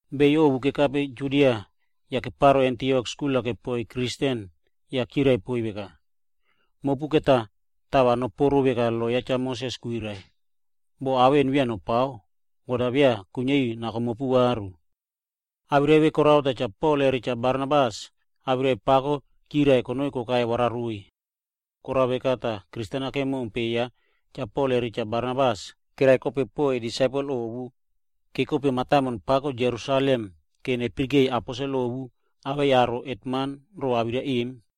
Beyo ovu kekape Judia yah keparo mataimon Antiok skul-a kepoiy Kristen tah chirai poiy veka, “Mopu va tava nopuoro veka lo ya Cha Moses kwirai ero, boh ao vemona beya nopao, God-a beya kuiniari nako mopu varu vai.” Awirai vemona korao tah Cha Pol re Cha Barnabas awirai pako keyirai konoi kokai wararoiy. Korao veka tah Kristen-a kemompe yei Cha Pol re Cha Barnabas awei disaipel ovu, va nekope mataimon pako Jerusalem va neyarai aposel ovu awei hetman ro awirai vemona.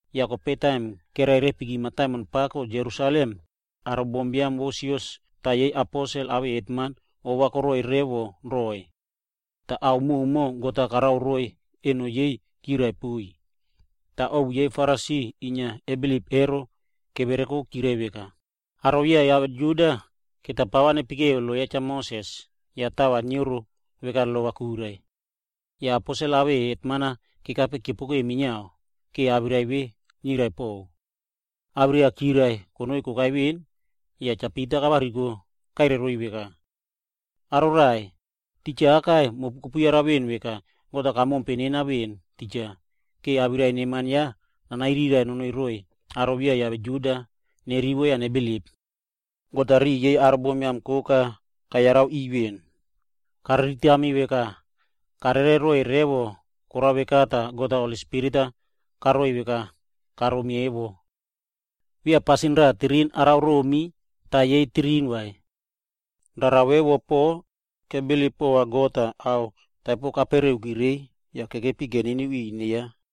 Yah taim kererepiki mataimon pako Jerusalem, aro bombiam vo sios awei aposel yah yei hetman oꞌto va koteiy roiy poaka. Yah ao koka God-a karao roiy eno peꞌe yei ero, keyirai poiy. Toh kope ovu yei Farisi kesave kebilip ero, kevereko tah chirai veka, “Aro beya kiave Juda ero, va pa nepekeu lo ya Cha Moses yah tava nioro veka lo-a kwirai ero.” Yah aposel awei hetman-a kekape keopokeu minia va awirai vemona niriraiꞌvo. Awirai-a chirai konoi kokai veꞌen, yah kope Cha Pita kavariko nake tah kairai roiy veka, “Aro raꞌai, titja aka, mopu kopu yara veꞌen veka God-a kamompe nena veꞌen, va awirai neman ya nanairiraiꞌvo nonoi roiy aro beya kiave Juda va nerivo yah nebilip. God-a riꞌi yei aro bombiam koka kapirikeu veni. Emo kariritami veka karere roiy revo. Korao veka tah, God-a Holi Spirit-a karoiy veka memi karomi emo. Beya pasin raꞌa tirin karao romi tah yei pasin raꞌa tirin karao roiy vai. Rara vo vemona kebilip pova God pon tah ao taipere kapereuki reiy yah kekepi keniniu ri ine ya.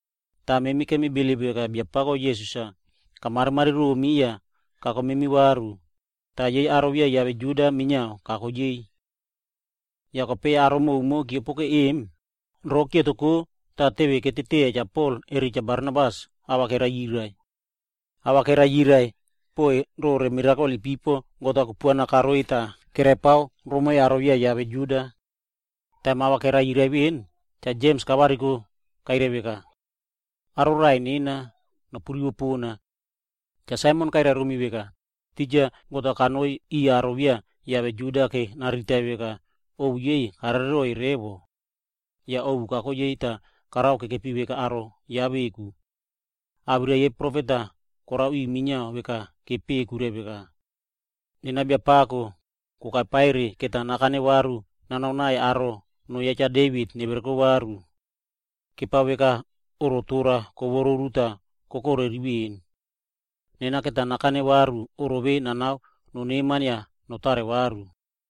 Toh kemi bilip veka Biapako Jisas-a kamarimari romi tah kako memi varu, yah yei aro beya kiave Juda minia kako yei.” Yah kope aro koka keopokeu emo, rova kepikimki tah ava kerivo poa Cha Pol re Cha Barnabas. Ava keyirai poiy pore mirakol ipipo God-a kupuana karoiy tah kerepao romoi aro beya kiave Juda ero. Taim awirai-a keyirai veꞌen, Cha Jems kavariko yah kairai veka, “Aro raꞌai nena, nopu rivo pona. Cha Saimon kairai romi veka, titja God-a kanoi riꞌiy aro beya kiave Juda vora nariritai veka karere roiy revo ovu yei. Yah ovu kako yei vora narao nekepi veka aro ya veku. Awirai yei profet-a korao ri minia veka kepeꞌe kwirai veka, ‘Nena Biapako, kope pa va nakane varu nanao aro noꞌo ya Cha Devit nevereko varu. Kepao veka oꞌro tora korei yah kokorari veꞌen. Nena va nakane varu oꞌro vemona nanao noneman yah notare varu.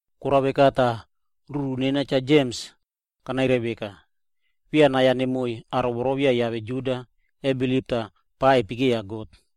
“Korao veka tah ruru nena Cha Jems, kanairai veka, ‘Memi beya nai-a nemoiy aro beya kiave Juda inia kebilip tah pava kepekeya God ero vai.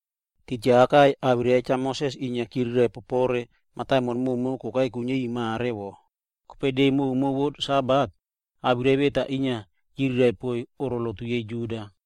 Titja aka awirai ya Cha Moses inia chiriraiꞌvo rore mataimon koka kokai kuiniari mare, tah kope de koka vo Sabat, awirai vemona chiriraiꞌvo poiy oꞌro lotu yei Juda.”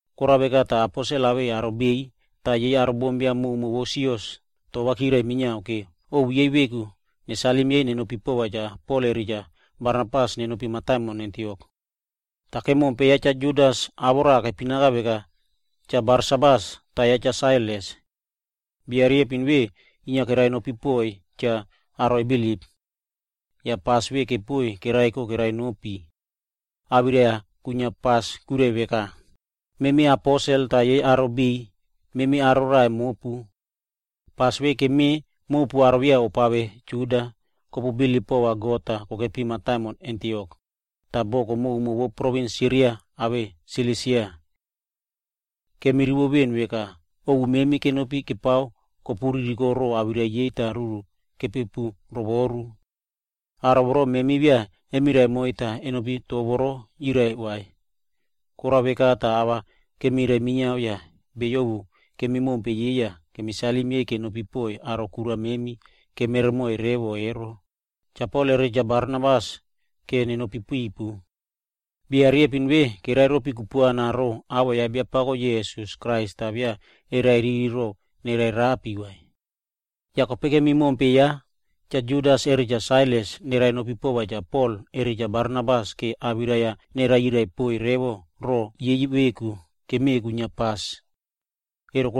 Korao veka tah aposel awei aro biꞌiy yah yei aro bombiam koka vo sios awirai-a chirai minia va ovu yei veku nesalim yei nenopi pova Cha Pol re Cha Barnabas nenopi mataimon Antiok. Yah Cha Judas kemompe awoꞌo ya raꞌa kepinaka veka Cha Barsabas, yah ya Cha Sailas. Bia riyempin vemona inia kerenopi poiy cha aro kebilip ero. Yah pas vemona kepoiy kereko kerenopi. Yah awirai kwinia pas emo kwirai veka, “Memi aposel yah yei aro biꞌiy memi raꞌai mopu aka. Memi pas vemona kemeꞌe mopu aro beya kopave Juda tah kopu bilip pova God yah kokepi mataimon Antiok tah boko koka vo provins Siria re Silisia. Kemirivo veꞌen veka aro memi ovu kenopi kepao kopu ririko toro po awirai yei tah ruru-a kepu rovoru. Aro vemona memi beya kemirai moiy tah kenopi awirai voro chirai vai. Korao veka tah ava kemirai minia yah beyo ovu kemi mompe tah kemi salim yei kenopi poiy kura riyempin memi kemi save kemere moiy revo ero, Cha Pol re Cha Barnabas va nenopi pipu. Bia riyempin vemona kereropi kupuana po awoꞌo ya Biapako memi Jisas Krais tah beya kereriri va nererapi vai. Yah kope Cha Judas re Cha Sailas kemi mompe va nerenopi pova Cha Pol re Barnabas vora awirai-a nereyirai revo roꞌo yei veka kemeꞌe kwinia pas ero.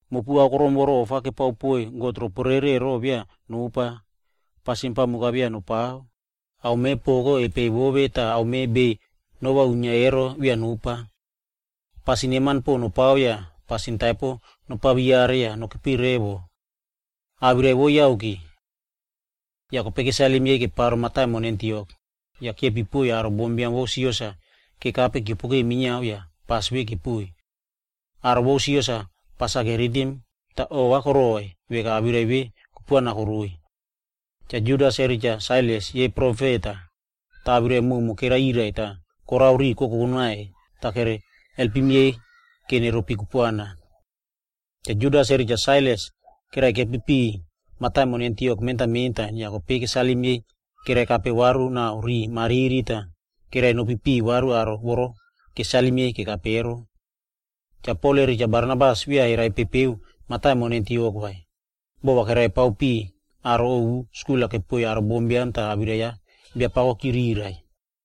Mopu akorom voro ofa keparepare poiy god giaman ero beya nopa vai, yah pasin pamuk-a beya nopao tah aome poko kepeiy vove, tah aome noo kerinia bei rere ero beya nopa vai. Pasin neman pon nopao yah nopaveyareki pasin taipere yah va nokepi revo. Awirai vo yake.” Yah kope kesalim yei keparo mataimon Antiok, yah keipiy aro bombiam vo sios-a kekape keopokeu minia tah pas vemona kepoiy. Aro vo sios-a pas-a keritim tah ova koroiy veka awirai vemona kupuana koroiy. Cha Judas re Cha Sailas emo yei profet tah awirai prumo keyiriraiꞌvo yah riꞌi kokokore naiy tah kere alpim yei vora neropi kupuana. Cha Judas re Cha Sailas kerekepiki piꞌiy mentan mentan mataimon Antiok yah kope kesalim yei kerekape varu nao riꞌi mariri tah kerenopi varu riꞌiy aro voro kesalim yei kekape ero.b Cha Pol re Cha Barnabas beya mataimon Antiok-a kerepepeu bereren vai, boho va kerepao piꞌiy aro ovu yah skul-a kepoiy aro bombiam tah awirai ya Biapako chiriraiꞌvo.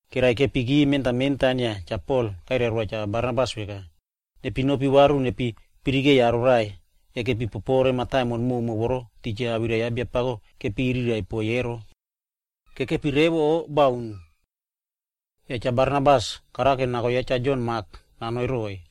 Kerekepiki mentan mentan yah Cha Pol kairai roa Cha Barnabas veka, “Va nepi nopi varu yah nepi yarai aro raꞌai kekepi popore mataimon voro titja awirai ya Biapako kepiriraiꞌvo poiy ero. Kekepi revo o bauni.” Yah Cha Barnabas karao nako ya Cha Jon Mak nanoi roiy.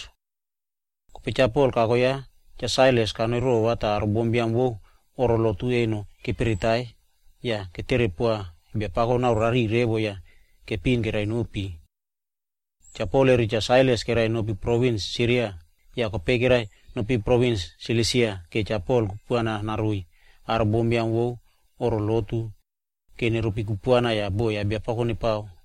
Yah kope Cha Pol kako ya Cha Sailas kanoi rova tah aro bombiam vo oꞌro lotu eno keperetai yah ketere poa Biapako naore rariꞌiy revo yah kepiꞌin kerenopi. Cha Pol re Cha Sailas kerenopi provins Siria re provins Silisia va Cha Pol kupuana naroiy aro bombiam vo oꞌro lotu vora neropi kupuana yah boho ya Biapako nepao.